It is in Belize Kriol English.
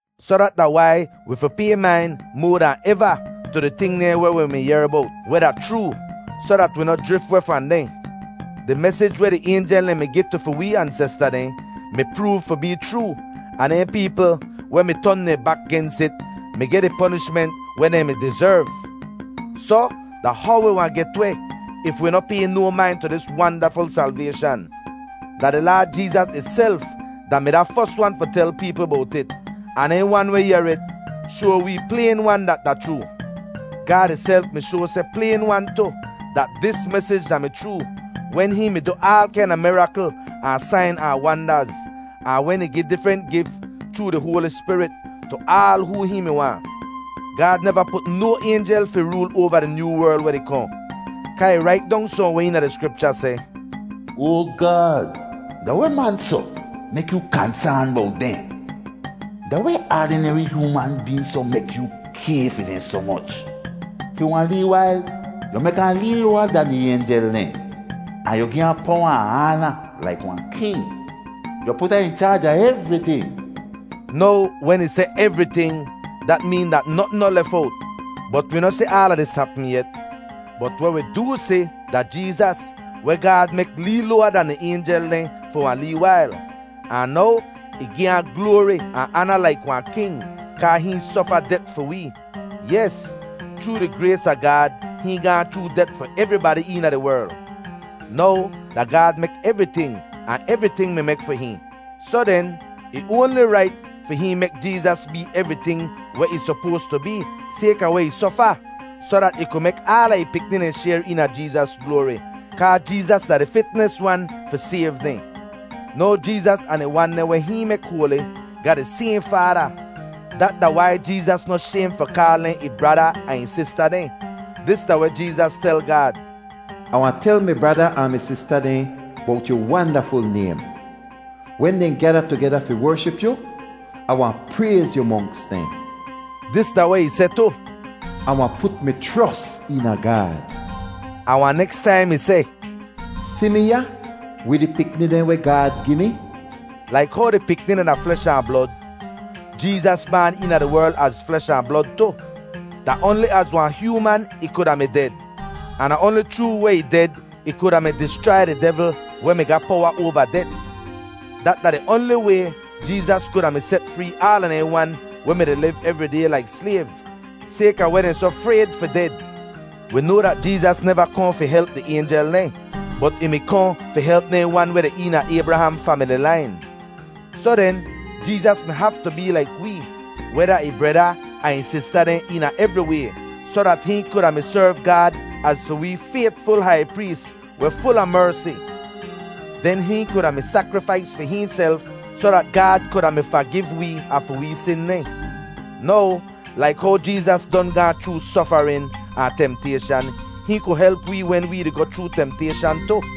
Soh dat da wai wi fi pay main moa dan eva tu di ting dehn weh wi mi yehr bowt, weh da chroo, soh dat wi noh jrif weh fahn dehn. Di mesij weh di aynjel dehn mi gi tu fi wee ansesta dehn mi proov fi bee chroo, ahn dehn peepl weh mi ton dehn bak gens it mi geh di ponishment weh dehn mi dizerv. Soh, da how wi wahn get weh if wi noh pay no main tu dis wandaful salvayshan? Da di Laad Jeezas ihself da-mi da fos wan fi tel peepl bowt it, ahn dehn wan weh yehr it shoa wee playn-wan dat da chroo. Gaad ihself mi shoa seh playn-wan tu, dat dis mesij da-mi chroo wen hihn mi du aal kaina mirakl ahn sain ahn wandaz, ahn wen ih gi difrent gif chroo di Hoali Spirit tu aal hoo hihn mi waahn. Gaad neva put no aynjel fi rool oava di nyoo werl weh di kohn. Kaa ih rait dong sohnweh eena di Skripcha seh, “Oa Gaad, da weh man soh mek yoo kansaan bowt dehn? Da weh aadineri hyooman been soh mek yu kay fi dehn soh moch? Fi wahn lee wail yu mek ahn lee loawa dan di aynjel dehn. Ahn yu gi ahn powa ahn aana laik wahn king. Yu put ahn in chaaj a evriting.” Now, wen ih seh “evriting,” dat meen dat notn noh lef owt. Bot wi noh si aala dis hapm yet. Bot weh wi doo si da Jeezas, weh Gaad mek lee loawa dan di aynjel dehn fi wahn lee wail. Ahn now, ih gi ahn gloari ahn aana laik wahn king, kaa hihn sofa det fi wee. Yes, chroo di grays a Gaad hihn gaahn chroo det fi evribadi eena di werl. Now, da Gaad mek evriting, ahn evriting mi mek fi hihn; soh den, ih oanli rait fi hihn mek Jeezas bee evriting weh ih sopoas tu bee sayka weh ih sofa, soh dat ih ku mek aala ih pikni dehn shayr eena Jeezas gloari. Kaa Jeezas da di fitnis wan fi sayv dehn. Now Jeezas ahn di wan dehn weh hihn mek hoali ga di sayhn Faada. Dat da wai Jeezas noh shaym fi kaal dehn ih brada ahn ih sista dehn. Dis da weh Jeezas tel Gaad: “Ah wahn tel mi brada ahn mi sista dehn bowt yu wandaful naym. Wen dehn gyada tugeda fi wership yu, Ah wahn prayz yu monks dehn.” Dis da weh ih seh tu: “Ah wahn put mi chros eena Gaad.” Ahn wahn neks taim ih seh, “Si mi ya wid di pikni dehn weh Gaad gi mi.” Laik how di pikni dehn da flesh ahn blod, Jeezas baan eena di werl az flesh ahn blod tu. Da oanli az wahn hyooman ih kuda mi ded, ahn da oanli chroo weh ih ded ih kuda mi dischrai di devl weh mi ga powa oava det. Dat da di oanli way Jeezas kuda mi set free aala dehn wan weh mi-di liv evri day laik slayv, sayka weh dehn soh frayd fi ded. Wi noa dat Jeezas neva kohn fi help di aynjel dehn, bot ih mi kohn fi help dehn wan weh deh eena Aybraham famili lain. Soh den, Jeezas mi haftu bee laik wee, weh da ih breda ahn ih sista dehn eena evri way, soh dat hihn kuda mi serv Gaad az fi wee faytful hai prees weh ful a mersi. Den hihn kuda mi sakrifais fi hihnself soh dat Gaad kuda mi fagiv wee a fi wee sin dehn. Now, laik how Jeezas don gaahn chroo sofarin ahn temtayshan, hihn ku help wee wen wee di goh chroo temtayshan tu.